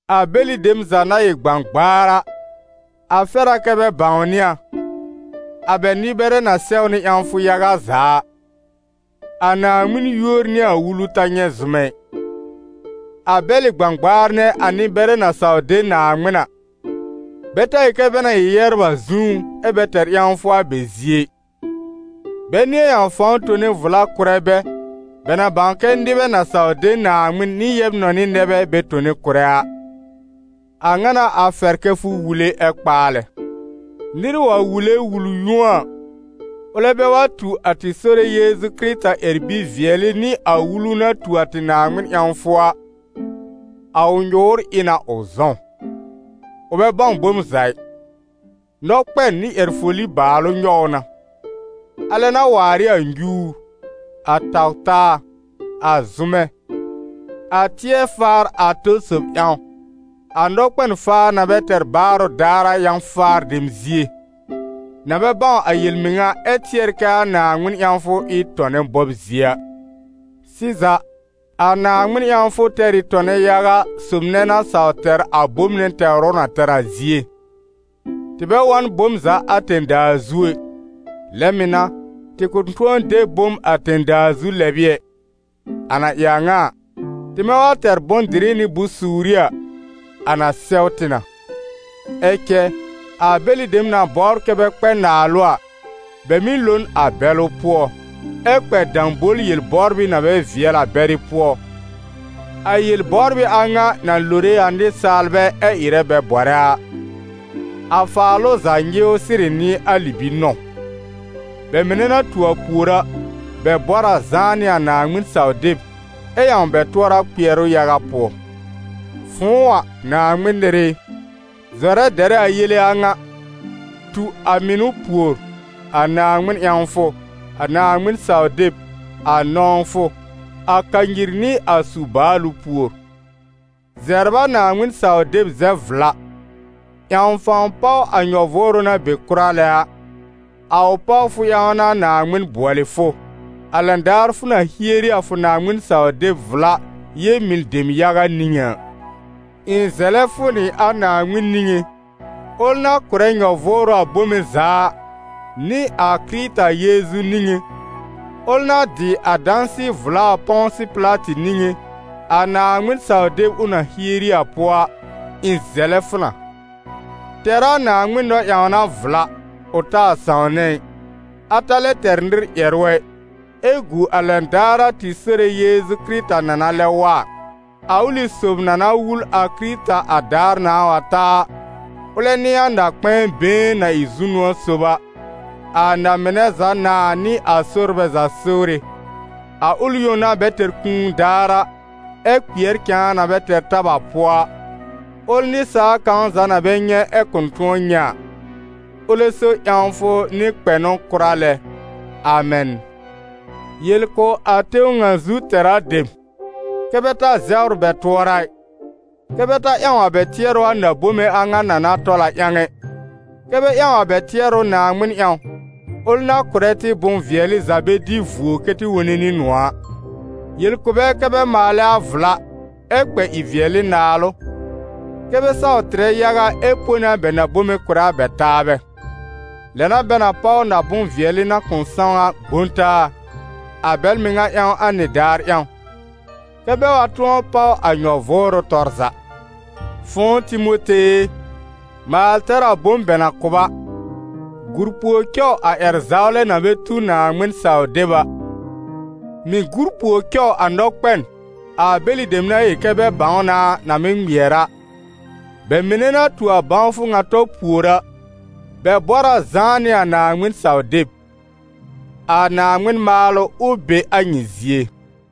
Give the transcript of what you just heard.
A bɛlɩ dem za na ɩ gbãgbaar a, a fɛr a kɛ́ bɛ bãwnɩ a, a bɛ nɩ-bɛrɛ na sɛw nɩ ƴãwfʋ yaga za a, a Naaŋmɩn yúor nɩ a wulu ta nyɛ̃ zʋmɛ ɩ. A bɛlɩ gbãgbaar nɛ a nɩ-bɛrɛ na saw de Naaŋmɩn a, bɛ ta yel kɛ bɛ na ɩ yɛbr a zũú, ɛ́ bɛ tɛr ƴãwfʋ a bɛ zie ɩ. Bɛ nɩ̃ɛ ƴãw fãw tone vla kʋ̀rɛ bɛ, bɛ na bãw kɛ nɩbɛ na saw de Naaŋmɩn nɩ yɛb-nɔnɩ nɛ bɛ bɛ tone kʋ̀rɛ a. A a ŋa n'a a fɛr kɛ fʋ wule ɛ kpaalɛ. Nɩr wa wule wul-yũo a, ʋlɛ bɛ wa tu a tɩ Sore Yeezu Kɩrɩta ƴɛr-bi-vɩɛlɩ nɩ a wulu na tu a tɩ Naaŋmɩn ƴãwfʋ a, a ʋ nyʋ̀ʋ́r ɩ na ʋ zɔ̃w. Ʋ bɛ bãw bom za ɩ, nɔkpɛn nɩ ƴɛr-foli bàalʋ nyɔw ʋ na. Alɛ n'a waar ɩ a nyuur, a taw-taa, a zʋmɛ, a tɩɛr-faar a tɔ sob ƴãw, a nɔkpɛn-faa na bɛ tɛr baarʋ daar a yã-faar dem zie, na bɛ bãw a yel-mɩŋa ɛ tɩɛr kɛ a Naaŋmɩn ƴãwfʋ ɩ n tɔnɛ bɔb zie a. Sɩza, a Naaŋmɩn ƴãwfʋ tɛr ɩ tɔnɛ yaga sob nɛ na saw tɛr a bom nɛ tɛwr ʋ na tɛr a zie. Tɩ bɛ wa n bom za a tẽ-daa zu ɛ; lɛ mɩ̀ n'a, tɩ kʋ̃ tʋ̃ɔ de bom a tẽ-daa zu lɛb ɩ ɛ. A na ɩ a ŋa a, tɩmɛ wa tɛr bʋ̃-dɩrɩ nɩ bʋ̃-suuri a, a na sɛw tɩ na. Ɛ cɛ a bɛlɩ dem na bɔbr kɛ́ bɛ kpɛ naalʋ a, bɛ mɩ́ lo n a bɛlʋ pʋɔ, ɛ kpɛ dãbol-yel-bɔbrɩ na bɛ vɩɛl a bɛrɩ pʋɔ, a yel-bɔbrɩ a ŋa na lore a nɩsaalbɛ ɛ ɩrɛ bɛ bɔrɛ a. A faalʋ za nyɩwr sɩrɩ n'ɩ a libi-nɔ̃w. Bɛ mɩnɛ na tu a pùor a, bɛ bɔr a zãá nɩ a Naaŋmɩn-saw-deb ɛ ƴãw bɛ tʋɔra kpɩɛrʋ yaga pʋɔ. Fʋ̃ʋ a, Naaŋmɩn nɩr ɩ, zɔrɛ dɛrɛ a yele a ŋa. Tu a mɩnʋ pùor, a Naaŋmɩn ƴãwfʋ, a Naaŋmɩn-saw-deb, a nɔ̃wfʋ, a kanyir nɩ a su-baalʋ pùor. Zɛbr a Naaŋmɩn-saw-deb zɛb-vla; ƴãw fãw páw a nyɔ-vʋʋrʋ na be kʋra lɛ a, a ʋ pawfʋ ƴãw n'a Naaŋmɩn bʋɔlɩ fʋ, a lɛn daar fʋ na hieri a fʋ Naaŋmɩn-saw-deb vla, yel-mɩn dem yaga niŋé a. Ɩ̃ zɛlɛ fʋ nɩ a Naaŋmɩn niŋé, ʋl na kʋ̀rɛ nyɔ-vʋʋrʋ a bome za a, nɩ a Kɩrɩta Yeezu niŋé, ʋl na dɩ a dãsɩ-vla a Pɔ̃sɩ Pɩlatɩ niŋé, a Naaŋmɩn-saw-deb ʋ na hieri a pʋɔ a, ɩ̃ zɛlɛ fʋ na: tɛr a Naaŋmɩn nɔ-ƴãwna vla, ʋ taa sãwnɛ ɩ, a ta lɛ tɛr nɩr ƴɛrʋ ɛ, ɛ gu a lɛn daar a tɩ Sore Yeezu Kɩrɩta na na lɛb wa a. A ʋlɩ sob na na wul a Kɩrɩta a daar nãà wa ta a, ʋlɛ n'ɩ a Na-kpɛ̃ɛ been na ɩ zu-nʋ̃ɔ̀ sob a, a na-mɩnɛ za Nãa nɩ a sorbɛ za Sore, a ʋl yõ na bɛ tɛr kũu daar a, ɛ kpɩɛr cãa na bɛ tɛr tab a pʋɔ a, ʋl nɩsaal kãw za na bɛ nyɛ̃ ɛ kʋ̃ tʋ̃ɔ nyɛ̃ a. Ʋlɛ so ƴãwfʋ nɩ kpɛnʋ kʋra lɛ. Amɛn. Yel kʋ̀ a tẽw ŋa zu tɛra dem, kɛ́ bɛ ta zɛwr bɛ tʋɔra ɩ, kɛ́ bɛ ta ƴãw a bɛ tɩɛrʋ a na-bome a ŋa na na tɔl a ƴãw ɛ, kɛ́ bɛ ƴãw a bɛ tɩɛrʋ Naaŋmɩn ƴãw, ʋl na kʋ̀rɛ tɩ bʋ̃-vɩɛlɩ za bɛ dɩ vuo kɛ́ tɩ wone nɩ nʋ̃ɔ̀ a. Yel kʋ̀ bɛ kɛ́ bɛ maalɛ a vla, ɛ kpɛ ɩ-vɩɛlɩ naalʋ, kɛ́ bɛ saw tɩrɛ yaga ɛ pone a bɛ bome kʋ̀rɛ a bɛ taabɛ. Lɛ n'a bɛ na páw na-bʋ̃-vɩɛlɩ na kʋ̃ sãw a gbõ taa, a bɛl mɩŋa ƴãw a nɩdaar ƴãw, kɛ́ bɛ wa tʋ̃ɔ páw a nyɔ-vʋʋrʋ tɔr za. Fʋ̃ʋ Timote e, maal tɛr a bom bɛ na kʋ̀ b a; gùr pùor cɔw a ƴɛr-zawlɛ na bɛ tu Naaŋmɩn-saw-deb a, mɩ̀ gur pùor cɔw a nɔkpɛn, a bɛlɩ dem na yel kɛ bɛ bãw na a, na mɩ́ ŋmɩɛr a. Bɛ mɩnɛ na tu a bãwfʋ ŋa tɔ pùor a, bɛ bɔr a zãá nɩ a Naaŋmɩn-saw-deb. A Naaŋmɩn maalʋ, ʋ be a nyɩ zie!